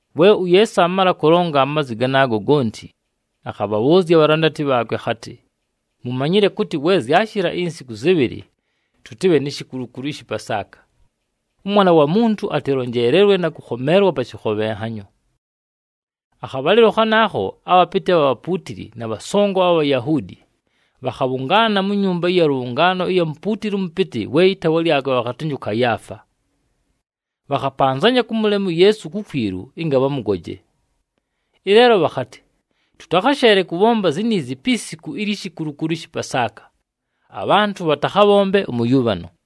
We uYeesu aamala kʉlonga amazwi ganaago gonti, akhabhabhʉʉzya abhalandati bhaakwe akhatɨ, “Mumanyile kʉtɨ we zyashɨla insiku zɨbhɨlɨ, tʉtɨbhe ni shikulukulu ɨshɨ Pasaaka. ɄMwana wa Muntu atɨlonjeelelwe na kʉkhomeelwa pa shɨkhobhenhanyo.” Akhabhalɨlo khanaakho, abhapɨtɨ abha bhapuutili na bhasongo abha Bhayahuudi, bhakhabhʉngaana mu nyumba ɨya lʉbhʉngaano ɨya mupuutili ʉmʉpɨtɨ, we ɨtaawa lyakwe bhakhatɨnjɨ ʉKayaafa. Bhakhapanzanya kʉmʉlema uYeesu kukwilu ɨnga bhamʉgoje. Ɨleelo bhakhatɨ, “Tʉtakhasheele kʉbhomba ziniizi pi siku ilyi shikulukulu ɨshɨ Pasaaka, abhantʉ bhatakhabhombe ʉmʉyʉbhano.”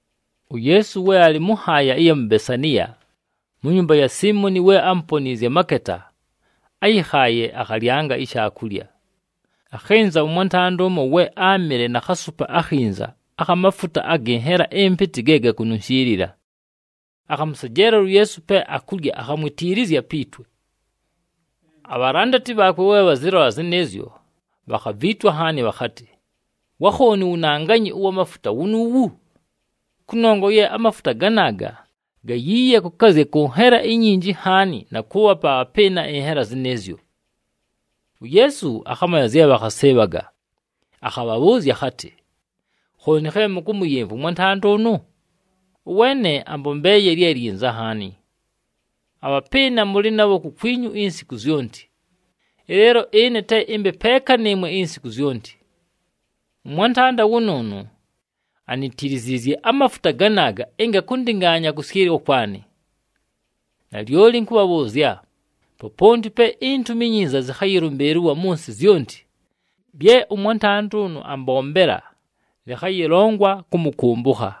UYeesu we alɨ mʉ nhaaya ɨya mu Besaniya, mu nyumba ya Siimoni we ámuponiizye amaketa, áyɨkhaaye akhalyanga ishaakulya. Akhɨnza ʉmwantanda ʉmo we áamɨle na khasupa akhinza akha mafuta agɨ nhela ɨmpɨtɨ ge gakununshiilila, akhamʉsejeelela uYeesu pe akulya akhamwitiilizya pi twe. Abhalandati bhaakwe we bhazɨlola zɨnɨɨzyo, bhakhaviitwa nhaani bhakhatɨ, “Wa khooni uwunanganyi ʉwa mafuta wunuuwu? Kʉnongwa ye amafuta ganaaga gayiiye kʉkazya kʉ nhela inyinji nhaani na kʉʉbhapa abhapɨɨna ɨnhela zɨnɨɨzyo!” UYeesu akhamanya zye bhakhasɨɨbhaga, akhabhabhʉʉzya akhatɨ, “Khooni khe mʉkʉmʉyɨmvwa ʉmwantanda ʉnʉ? Ʉweene ambombeeye lye lyinza nhaani. Abhapɨɨna mʉlɨ nabho kukwinyu insiku zyonti, ɨleelo ɨne te ɨmbe peeka nɨɨmwe insiku zyonti. Ʉmwantanda wʉnʉʉnʉ anitiliziizye amafuta ganaaga ɨnga kʉndɨngaanya kʉsyɨlwa kwanɨ. Nalyoli ɨnkʉbhabhʉʉzya, poponti pe iNtumi iNyinza zɨkhayɨlʉmbɨɨlɨlwa mʉ nsɨ zyonti, lye ʉmwantanda ʉnʉ ambombela lɨkhayɨlongwa kʉmʉkʉmbʉkha.”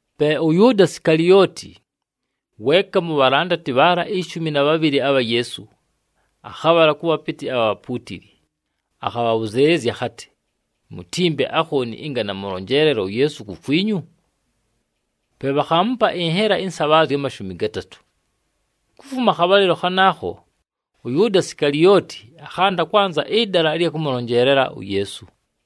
Pe ʉYʉʉda Sikalioti, weeka mu bhalandati bhaala ishumi na bhabhɨlɨ abha Yeesu, akhabhala kʉ bhapɨtɨ abha bhapuutili, akhabhʉzɨɨlɨzya akhatɨ, “Mutimpe akhooni ɨnga namʉlonjeelela uYeesu kukwinyu?” Pe bhakhaamupa ɨnhela ɨnsabhaazya amashumi gatatʉ. Kufuma akhabhalɨlo khanaakho, ʉYʉʉda Sikalioti akhanda kwanza ɨdala ɨlya kʉmʉlonjeelela uYeesu.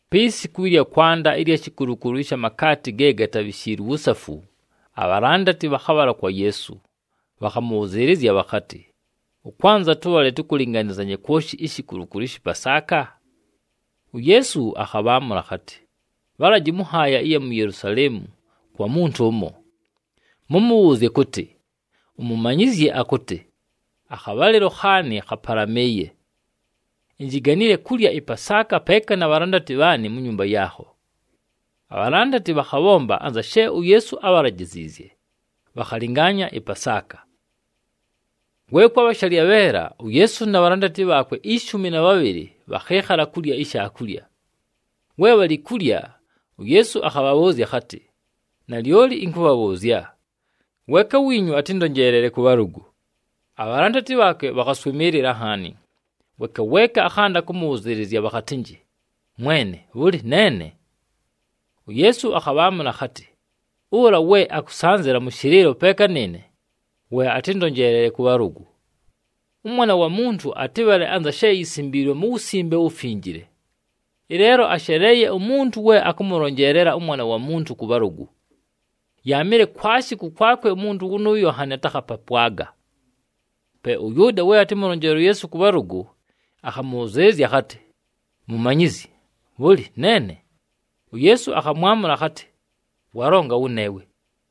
Pi siku ɨlya kwanda ilyi shikulukulu ɨsha makaati ge gatabhishiilwe uwusafu, abhalandati bhakhabhala kwa Yeesu, bhakhamʉbhʉzɨɨlɨzya bhakhatɨ, “Ʉkwanza tʉbhale tʉkʉlɨnganɨzanye kwoshi ishikulukulu ɨshɨ Pasaaka?” UYeesu akhabhaamʉla akhatɨ, “Bhalaji mʉ nhaaya ɨya mu Yelusaleemu kwa muntu ʉmo, mʉmʉbhʉʉzye kʉtɨ, ‘UMumanyizyi akʉtɨ, “Akhabhalɨlo khaanɨ khapalamɨɨye. Injiganile kulya ɨPasaaka peeka na bhalandati bhaanɨ mu nyumba yaakho.”’” Abhalandati bhakhabhomba anza she uYeesu ábhalajiziizye, bhakhalɨngaanya ɨPasaaka. We kwabha shalyabheela, uYeesu na bhalandati bhaakwe ishumi na bhabhɨlɨ bhakhɨɨkhala kulya ishaakulya. We bhalɨ kulya, uYeesu akhabhabhʉʉzya akhatɨ, “Nalyoli ɨnkʉbhabhʉʉzya, weeka wiinyu atɨndonjeelele kʉ bhalʉgʉ.” Abhalandati bhaakwe bhakhaswɨmɨɨlɨla nhaani, weeka weeka akhanda kʉmʉbhʉzɨɨlɨzya bhakhatɨnjɨ, “Mwene! Bhʉlɨ, neene?” UYeesu akhabhaamʉla akhatɨ, “Ʉla we akʉsanzɨla mʉ shɨlɨɨlo peeka nɨɨne, we atɨndonjeelele kʉ bhalʉgʉ. ɄMwana wa Muntu atɨbhale anza she yisimbiilwe mu Wusimbe uWufinjile. Ɨleelo asheleeye umuntu we akʉmʉlonjeelela ʉMwana wa Muntu kʉ bhalʉgʉ! Yaamɨle kwashi kʉkwakwe umuntu wʉnʉʉyo nhanɨ atakhapapwaga.” Pe ʉYʉʉda we atɨmʉlonjeelele uYeesu kʉ bhalʉgʉ, akhamʉbhʉzɨɨlɨzya akhatɨ, “Mumanyizyi! Bhʉlɨ, neene?” UYeesu akhamwamʉla akhatɨ, “Walonga wʉneewe.”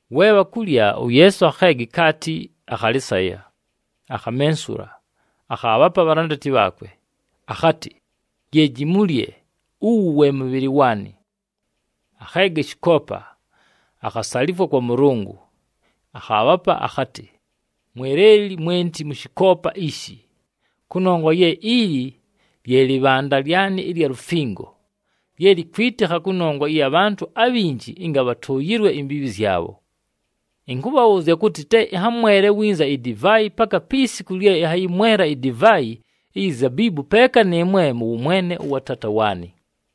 We bhakulya, uYeesu akheega ikaati, akhalɨsaya, akhamensula, akhaabhapa abhalandati bhaakwe, akhatɨ, “Yeeji mulye, uwu we mʉbhɨlɨ waanɨ.” Akheega ɨshɨkoopa, akhasalifwa kwa Mʉlʉngʉ, akhaabhapa, akhatɨ, “Mweleli mwenti mʉ shɨkoopa ishi. Kʉnongwa ye ili lye lɨbhanda lyanɨ ɨlya lufingo lye likwitikha kʉnongwa ɨya bhantʉ abhinji ɨnga bhatʉʉyɨlwe imbiibhi zyabho. Ɨnkʉbhabhʉʉzya kʉtɨ, te ɨnhamwele winza idivaayi paka pi siku lye ɨnhayɨmwela idivaayi iyi zabiibu peeka nɨɨmwe mʉ wʉmwene ʉwa Taata waanɨ.”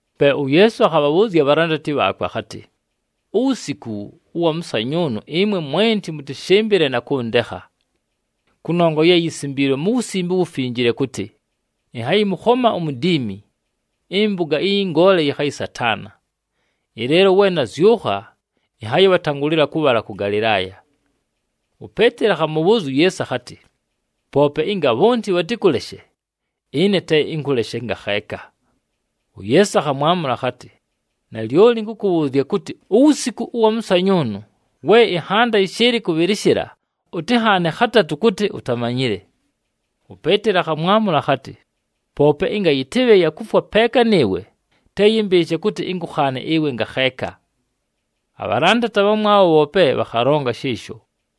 Pe uYeesu akhabhabhʉʉzya abhalandati bhaakwe akhatɨ, “Uwusiku ʉwa mʉsanyʉʉnʉ, ɨmwe mwenti mʉtɨshɨmbɨle na kʉndekha. Kʉnongwa ye yisimbiilwe mu Wusimbe uWufinjile kʉtɨ, ‘Ɨnhayɨmʉkhoma umudiimi, ɨmpʉga ɨyɨ ngoole yɨkhayɨsataana.’ Ɨleelo we nazyʉkha, ɨnhayɨbhatangʉlɨla kʉbhala kʉ Galɨlaaya.” UPeeteli akhamʉbhʉʉzya uYeesu akhatɨ, “Poope ɨnga bhonti bhatɨkʉleshe, ɨne te ɨnkʉleshe ngakheeka!” UYeesu akhamwamʉla akhatɨ, “Nalyoli ɨnkʉkʉbhʉʉzya kʉtɨ, uwusiku ʉwa mʉsanyʉʉnʉ, we ɨnhanda yɨshɨɨlɨ kʉbhɨlɨshɨla, ʉtɨnhaane khatatʉ kʉtɨ utamanyile.” UPeeteli akhamwamʉla akhatɨ, “Poope ɨnga yɨtɨbhe ya kufwa peeka nɨɨwe, te yɨmbɨɨshe kʉtɨ ɨnkʉkhaane ɨwe ngakheeka!” Abhalandati abhamwabho bhoope bhakhalonga shɨɨsho.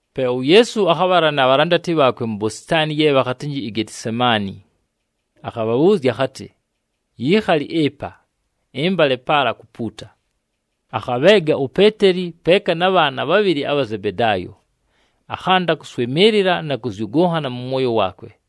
Pe uYeesu akhabhala na bhalandati bhaakwe mu bositaani ye bhakhatɨnjɨ iGetisemaani, akhabhabhʉʉzya akhatɨ, “Yiikhali ɨpa, ɨmbale paala kupuuta.” Akhabheega uPeeteli peeka na bhaana bhabhɨlɨ abha Zebedaayo, akhanda kʉswɨmɨɨlɨla na kʉzyʉgʉnhana mʉ mwoyo waakwe.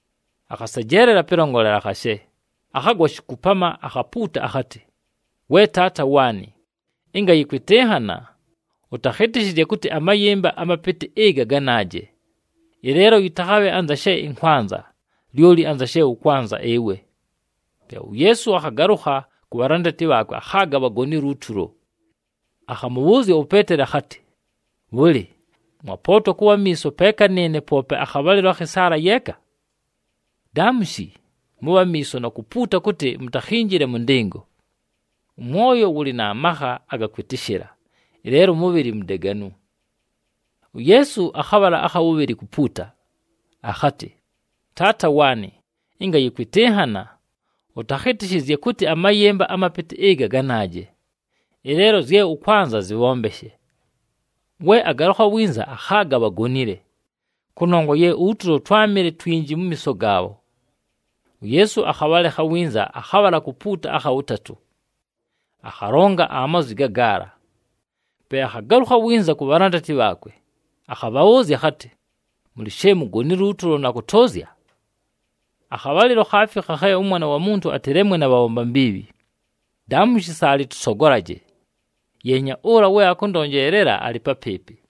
Akhasejela pɨlongolela khashe, akhagwa shikupama, akhapuuta akhatɨ, “We Taata waanɨ, ɨnga yɨkwɨtɨnhana, ʉtakhɨtɨshɨzye kʉtɨ amayɨmba amapɨtɨ ɨga ganaaje! Ɨleelo yɨtakhabhe anza she ɨnkwanza, lyoli anza she ʉkwanza ɨwe.” Pe uYeesu akhagalʉkha ku bhalandati bhaakwe, akhaaga bhagonile utulo. Akhamʉbhʉʉzya uPeeteli akhatɨ, “Bhʉlɨ, mwapootwa kʉbha amiiso peeka nɨɨne poope akhabhalɨlo akhɨ saala yeeka? Daamushi, mʉbhe amiiso na kupuuta kʉtɨ mutakhinjile mʉ ndɨngo. Ʉmwoyo wʉlɨ na makha aga kwɨtɨshɨla, ɨleelo ʉmʉbhɨlɨ mudeganu.” UYeesu akhabhala akha wʉbhɨlɨ kupuuta, akhatɨ, “Taata waanɨ, ɨnga yɨkwɨtɨnhana, ʉtakhɨtɨshɨzye kʉtɨ amayɨmba amapɨtɨ ɨga ganaaje! Ɨleelo zye ʉkwanza zɨbhombeshe.” We agalʉkha winza, akhaaga bhagonile, kʉnongwa ye utulo twámɨle twinji mu miiso gaabho. UYeesu akhabhalekha winza, akhabhala kupuuta akha wʉtatʉ, akhalonga amazwi gagaala. Pe akhagalʉkha winza ku bhalandati bhaakwe, akhabhabhʉʉzya akhatɨ, “Mʉlɨ she mugonile utulo na kʉtʉʉzya? Akhabhalɨlo khaafikha khe ʉMwana wa Muntu atɨlemwe na bhabhomba mbiibhi. Daamushi, saalɨ tʉsogolaje! Yeenya, ʉla we atɨndonjeelele alɨ papɨɨpɨ!”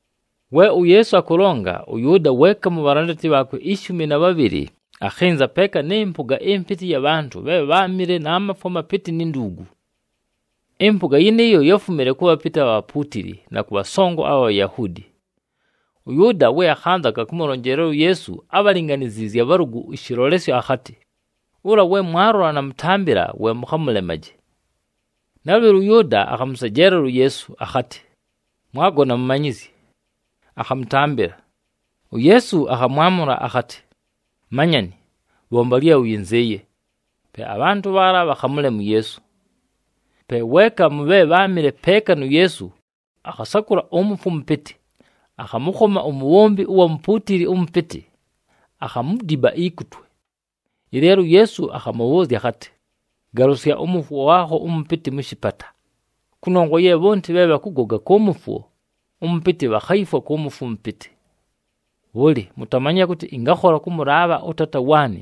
We uYeesu akʉlonga, ʉYʉʉda, weeka mu bhalandati bhaakwe ishumi na bhabhɨlɨ, akhɨnza peeka nɨ mpʉga ɨmpɨtɨ ɨya bhantʉ bhe bháamɨle na mafwo amapɨtɨ ni nduugu. Ɨmpʉga yɨnɨɨyo yáfumile kʉ bhapɨtɨ abha bhapuutili na kʉ bhasongo abha Bhayahuudi. ɄYʉʉda we akhanzaga kʉmʉlonjeelela uYeesu ábhalinganiziizye abhalʉgʉ ɨshɨlolesyo akhatɨ, “Ʉla we mwalola namʉtambɨla we mʉkhamʉlemaje.” Nalʉbhɨlo, ʉYʉʉda akhamʉsejeelela uYeesu, akhatɨ, “Mwagona Mumanyizyi!” Akhamʉtambɨla. UYeesu akhamwamʉla akhatɨ, “Manyani, bhomba lye ʉyɨnzɨɨye.” Pe abhantʉ bhaala bhakhamʉlema uYeesu. Pe weeka mʉ bhe bháamɨle peeka nu Yeesu, akhasakʉla ʉmʉfwo ʉmʉpɨtɨ, akhamʉkhoma umubhombi ʉwa mupuutili ʉmʉpɨtɨ, akhamudiba ikutwe. Ɨleelo uYeesu akhamʉbhʉʉzya akhatɨ, “Galʉsya ʉmʉfwo waakho ʉmʉpɨtɨ mʉ shɨpata, kʉnongwa ye bhonti bhe bhakʉgoga kʉ mʉfwo ʉmʉpɨtɨ bhakhayifwa kʉ mʉfwo ʉmʉpɨtɨ! Bhʉlɨ, mutamanyile kʉtɨ ɨngakhola kʉmʉlaabha ʉTaata waanɨ,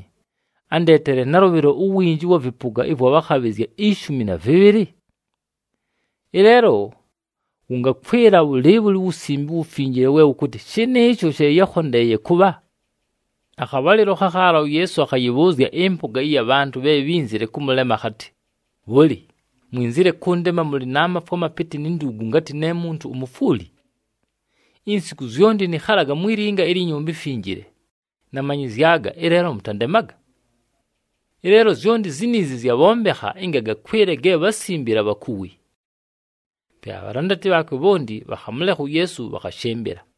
andeetele nalʉbhɨlo uwinji ʉwa vɨpʉga ɨvwa bhakhabhɨzya ishumi na vɨbhɨlɨ? Ɨleelo, wʉngakwɨla bhʉlɨɨbhʉlɨ uWusimbe uWufinjile we wʉkʉtɨ, shɨnɨɨsho she yákhondeeye kʉbha?” Akhabhalɨlo khakhaala uYeesu akhayɨbhʉʉzya ɨmpʉga ɨya bhantʉ bhe bhínzile kʉmʉlema akhatɨ, “Bhʉlɨ, mwinzile kʉndema mʉlɨ na mafwo amapɨtɨ ni nduugu ngatɨ ne muntu umufwuli? Insiku zyonti nɨkhalaga mwi linga ilyi Nyumba iMfinjile, namanyɨzyaga, ɨleelo mʉtandemaga! Ɨleelo zyonti ziniizi zyabhombekha ɨnga gakwɨle ge bhásimbile abhakuwi.” Pe abhalandati bhaakwe bhonti bhakhamʉlekha uYeesu bhakhashɨmbɨla.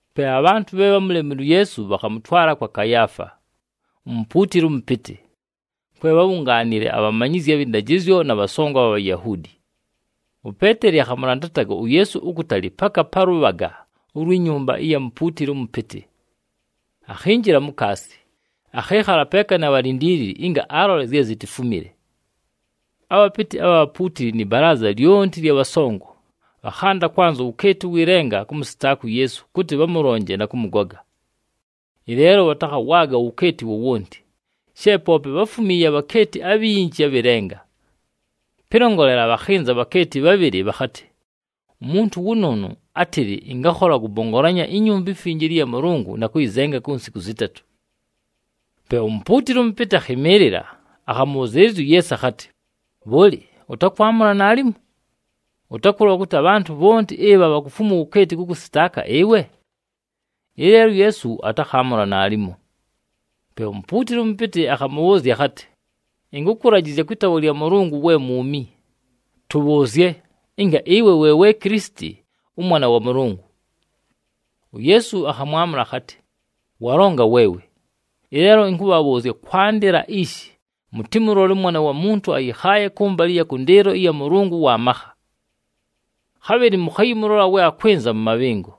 Pe abhantʉ bhe bhámulemile uYeesu bhakhamʉtwala kwa Kayaafa, umupuutili ʉmʉpɨtɨ, kwe bhábhungaanile abhamanyizyi abhɨ ndajɨzyo na bhasongo abha Bhayahuudi. UPeeteli akhamʉlandataga uYeesu ukutali paka pa lʉbhaga ulwi nyumba ɨya mupuutili ʉmʉpɨtɨ. Akhinjila mukaasi, akhɨɨkhala peeka na bhalindiilili ɨnga alole zye zitifumile. Abhapɨtɨ abha bhapuutili nɨ balaaza lyonti ɨlya bhasongo, bhakhanda kwanza uwukeeti ʉwɨ lenga kʉmʉsɨtaaka uYeesu kʉtɨ bhamʉlonje na kʉmʉgoga. Ɨleelo bhatakhawaaga uwukeeti wowonti, she poope bháfumiiye abhakeeti abhinji abhɨ lenga. Pɨlongolela, bhakhɨnza abhakeeti bhabhɨlɨ bhakhatɨ, “Umuntu wʉnʉʉnʉ átɨlɨ, ‘Ɨngakhola kʉpongolanya iNyumba iMfinjile ɨya Mʉlʉngʉ na kʉyɨzenga ku nsiku zɨtatʉ.’” Pe umupuutili ʉmʉpɨtɨ akhɨmɨɨlɨla, akhamʉbhʉzɨɨlɨzya uYeesu akhatɨ, “Bhʉlɨ, ʉtakwamʉla naalimo? Ʉtakʉlola kʉtɨ abhantʉ bhonti ɨbha bhakufumwa uwukeeti kʉkʉsɨtaaka ɨwe?” Ɨleelo uYeesu atakhaamʉla naalimo. Pe umupuutili ʉmʉpɨtɨ akhamʉbhʉʉzya akhatɨ, “Ɨnkʉkʉlajɨzya kwɨ taawa lya Mʉlʉngʉ we mwumi, tʉbhʉʉzye, ɨnga ɨwe we we Kilisiti, ʉMwana wa Mʉlʉngʉ.” UYeesu akhamwamʉla akhatɨ, “Walonga weewe! Ɨleelo ɨnkʉbhabhʉʉzya kwandɨla ishi mʉtɨmʉlole ʉMwana wa Muntu ayɨkhaaye kʉmbalɨ ɨya kʉndɨɨlo ɨya Mʉlʉngʉ ʉwa makha. Khabhɨlɨ mʉkhayɨmʉlola we akwɨnza mʉ mabhɨngo.”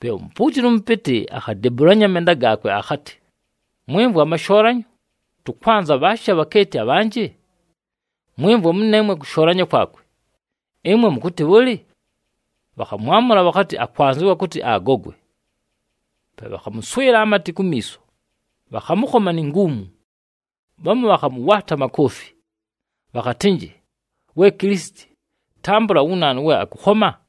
Pe umupuutili ʉmʉpɨtɨ akhadebulanya amenda gaakwe, akhatɨ, “Mwɨmvwa, amashoolanyo! Tʉkwanza bhaashi abhakeeti abhanjɨ? Mwɨmvwa mʉneemwe kʉshoolanya kwakwe! Ɨmwe mʉkʉtɨ bhʉlɨ?” Bhakhamwamʉla bhakhatɨ, “Akwanzɨwa kʉtɨ agogwe!” Pe bhakhamʉswɨla amatɨ kumiiso, bhakhamʉkhoma ni nguumu. Bhamu bhakhamʉwaata amakoofi, bhakhatɨnjɨ, “We Kilisiti, tambʉla wu naanu we akʉkhoma?”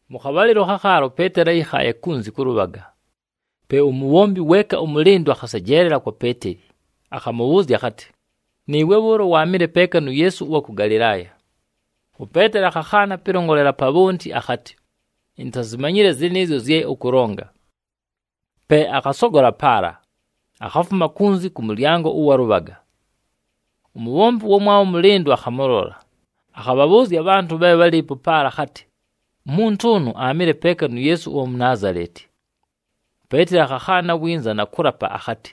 Mʉ khabhalɨlo khakhaala uPeeteli áyɨkhaaye pa lʉbhaga. Pe umubhombi weeka ʉmʉlɨndʉ akhasejeelela kwa Peeteli, akhamʉbhʉʉzya akhatɨ, “Nɨɨwe bhʉʉlo waamɨle peeka nu Yeesu ʉwa kʉ Galɨlaaya.” UPeeteli akhakhaana pɨlongolela pa bhonti akhatɨ, “Intazimanyile zɨnɨɨzyo zye ʉkʉlonga!” Pe akhasogola paala, akhafuma kunzi kʉ mʉlyango ʉwa lʉbhaga. Umubhombi ʉwamwabho ʉmʉlɨndʉ akhamʉlola, akhabhabhʉʉzya abhantʉ bhe bhálɨɨpo paala akhatɨ, “Umuntu ʉnʉ aamɨle peeka nu Yeesu ʉwa mu Naazaleti.” UPeeteli akhakhaana winza na kʉlapa akhatɨ,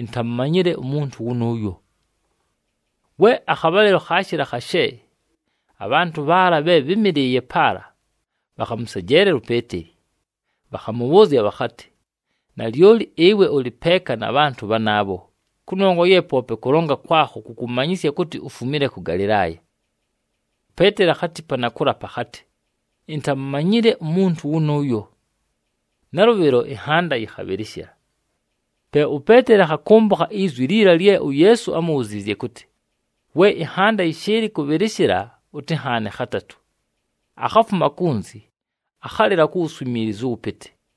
“Intamumanyile umuntu wʉnʉʉyo!” We akhabhalɨlo khaashɨla khashe, abhantʉ bhaala bhe bhɨ́mɨlɨɨye paala, bhakhamʉsejeelela uPeeteli, bhakhamʉbhʉʉzya bhakhatɨ, “Nalyoli ɨwe ʉlɨ peeka na bhantʉ bhanaabho, kʉnongwa ye poope kʉlonga kwakho kʉkʉmanyɨsya kʉtɨ ufumile kʉ Galɨlaaya!” UPeeteli akhatipa na kʉlapa akhatɨ, “Intamumanyile umuntu wʉnʉʉyo!” Nalʉbhɨlo ɨnhanda yɨkhabhɨlɨshɨla. Pe uPeeteli akhakʉmbʉkha izwi liila lye uYeesu ámubhuziizye kʉtɨ, “We ɨnhanda yɨshɨɨlɨ kʉbhɨlɨshɨla, ʉtɨnhaane khatatʉ.” Akhafuma kunzi, akhalɨla ku wuswimiilizu ʉwʉpɨtɨ.